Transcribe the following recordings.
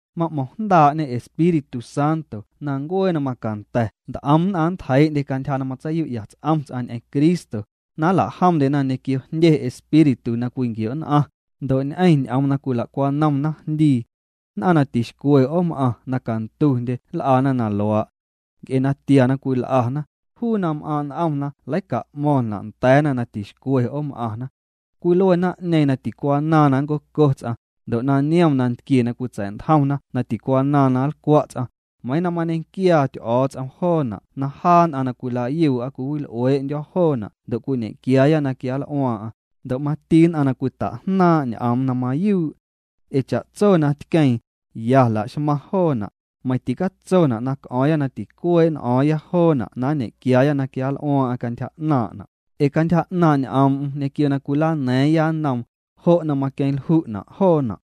Ma'mo̱ⁿjndaa'ñe Espíritu Santo na ncuee na macanda̱ nt'om nn'aⁿ nntjeii'ndye cantyja na matseiyu'ya ts'om ts'aⁿ ñ'eⁿ Cristo, na nla'jomndyena ñequio jndye espíritu na cwinquio'nn'aⁿ, ndo' ñ'eⁿ ñ'oom na cwila'cwanom naⁿjndii. Nn'aⁿ na tixcwe 'oom'aⁿ na cantundyena nl'ana na luaa'. Nc'e natia na cwil'ana, juu na m'aaⁿ' n'omna leica'mo̱ⁿna' nda̱a̱na na tixcwe 'oom'aⁿna. Cwilue naⁿ'ñeeⁿ na ticwanaaⁿ na ncoco ts'aⁿ, ndo' na niom nantquie na cwitsa̱'ntjomna na ticwanaaⁿ na nlcwa' ts'aⁿ, meiiⁿ na mañequiaa Ty'o̱o̱ts'om joona' na jaa nn'aⁿ na cwila'yuu'a cwiwil'uee'ndyo̱ joona' ndo' cwiñe'quiaaya na quianl'uaaⁿ'aⁿ, ndo' mati nn'aⁿ na cwita'jnaaⁿ' ñ'oom na mayuu'. Ee cha'tso na tqueeⁿ, ya laxmaⁿ joona', meiⁿ ticatsona' na c'o̱o̱ⁿya na ticuee' n'o̱o̱ⁿya joona' na nñequiaaya na quianl'uaaⁿ'aⁿ cantyja 'naaⁿna', ee cantyja 'naaⁿ' ñ'oom'm ñequio na cwilana̱a̱ⁿya nnoom, jo' na maqueⁿlju'na' joona'.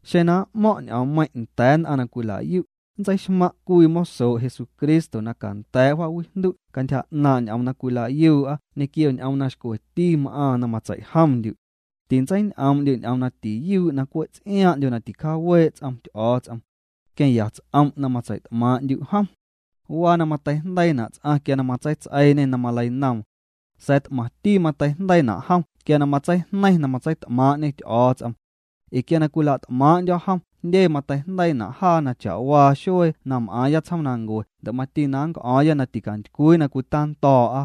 Xeⁿ na m'mo̱ⁿ' ñ'oommeiⁿ' nda̱a̱ nn'aⁿ na cwila'yu', nntseixmaⁿ' cwii mosoo' Jesucristo na canda̱a̱' wjaawijndu' cantyja 'naaⁿ' ñ'oom na cwila'yuu'a ñequio ñ'oom na xcweti m'aaⁿ na matseijomndyu'. Tintseiñ'oom'ndyu' ñ'oom na tiyuu'na' na cwe' ts'iaaⁿ'ndyo na ticjaawee' ts'om Ty'o̱o̱ts'om. Queⁿya ts'om' na matseit'maaⁿ'ndyu' jom. Waa na mateijndeiina' ts'aⁿ quia na matseits'eiiñê na maleinoom. Sa̱a̱ t'maⁿti mateijndeiina' jom quia na matseijneiⁿ na matseit'maaⁿ'ñê Ty'o̱o̱ts'om. Ee quia na cwila't'maaⁿ'ndyo̱ jom jndye mateijndeiina' jaa cha'waa xuee na m'aaⁿya tsjoomnancue ndo' mati na nnc'o̱o̱ⁿya na ticantycwii na cwitando̱o̱'a.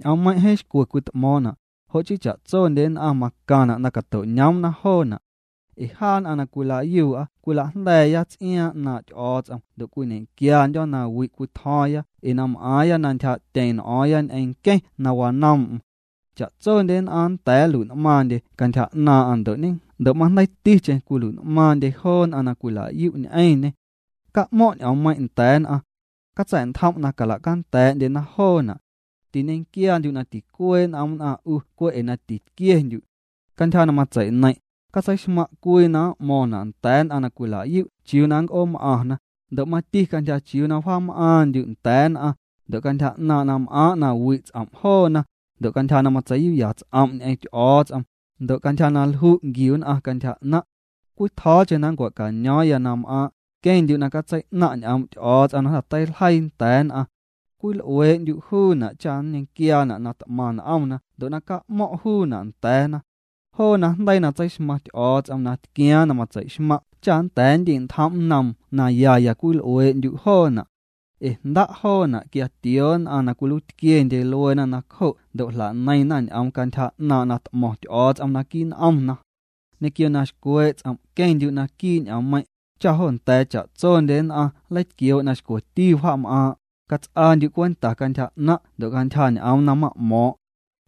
Ñ'oommeiⁿ' jeeⁿ xcwe cwit'mo̱o̱ⁿna', jo' chii cha'tsondye nn'aⁿ macaⁿna' na cato'ñoomna joona'. Ee jaa nn'aⁿ na cwila'yuu'a cwila'jnda̱a̱ya ts'iaaⁿ 'naaⁿ' Ty'o̱o̱ts'om ndo' cwiñe'quiandyo̱ na wi' cwitjo̱o̱ⁿya ee na m'aaⁿya na ntyjaa'tyeⁿ n'o̱o̱ⁿya ñ'eⁿ nqueⁿ na wanoom'm. Cha'tsondye nn'aⁿ nnda̱a̱ nlui'n'maaⁿndye cantyja 'naaⁿ'aⁿ ndo' majndeiiticheⁿ cwilui'n'maaⁿndye joo nn'aⁿ na cwila'yu' ñ'eⁿñê. Ca'mo̱ⁿ' ñ'oommeiⁿ' nda̱a̱ nn'aⁿ. Catsa̱'ntjom' na cala'canda̱a̱'ndyena joona'. Tiñequiaandyu' na ticuee' n'om nn'aⁿ 'u cwe' ee na titquiendyu'. Cantyja na matseineiⁿ', catseixmaⁿ' cwii na m'mo̱ⁿna' nda̱a̱ nn'aⁿ na cwila'yu' chiuu na nnc'oom'aⁿna, ndo' mati cantyja chiuu na wjaam'aaⁿndyu' nda̱a̱ nn'aⁿ, ndo' cantyja na m'aaⁿ' na wi' ts'om' joona, ndo' cantyja na matsei'yu'ya' ts'om' ñ'eⁿ Ty'o̱o̱ts'om, ndo' cantyja na lju' nquiu nn'aⁿ cantyja 'naⁿ'. Cwitjo̱o̱cheⁿ na nncua̱cano̱o̱ⁿya na m'aaⁿ', queⁿndyu' na catsei'naⁿ' ñ'oom' Ty'o̱o̱ts'om na jnda̱ teiljeii nda̱a̱ nn'aⁿ. Cwil'uee'ndyu' juuna' cha nñequiaana' na t'maⁿ n'omna ndo' ca'mo̱ⁿ' juuna' nda̱a̱na. Joo najndeii na tseixmaⁿ Ty'o̱o̱ts'om na tquiaaⁿ na matseixmaⁿ' cha nnda̱a̱ nndi'ntjom' nnoom ya ya cwil'uee'ndyu' joona'. Ee jnda' joona' quia tioo nn'aⁿ na cwiluiitquiendye lueena nacjo' ndo' jla'neiⁿna ñ'oom cantyja 'naⁿ' na t'mo̱ⁿ Ty'o̱o̱ts'om naquii' n'omna. Ñequio na xcwee' ts'om' queⁿndyu' naquii' ñ'oommeiⁿ', cha jo nda̱a̱ cha'tsondye nn'aⁿ nleitquioo' na xcweti wjaam'aaⁿ'. Cats'aandyu' cwenta cantyja 'naⁿ' ndo' cantyja ñ'oom na ma'mo̱o̱ⁿ'.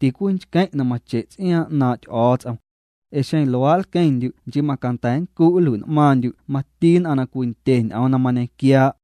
Ticwinchqueⁿ' na mache' ts'iaaⁿ 'naaⁿ' Ty'o̱o̱ts'om. Ee xeⁿ luaa' nlqueⁿndyu' nchii macanda̱ nncu' nlui'n'maaⁿndyu' mati nn'aⁿ na cwindye ñ'oom na mañequiaa'.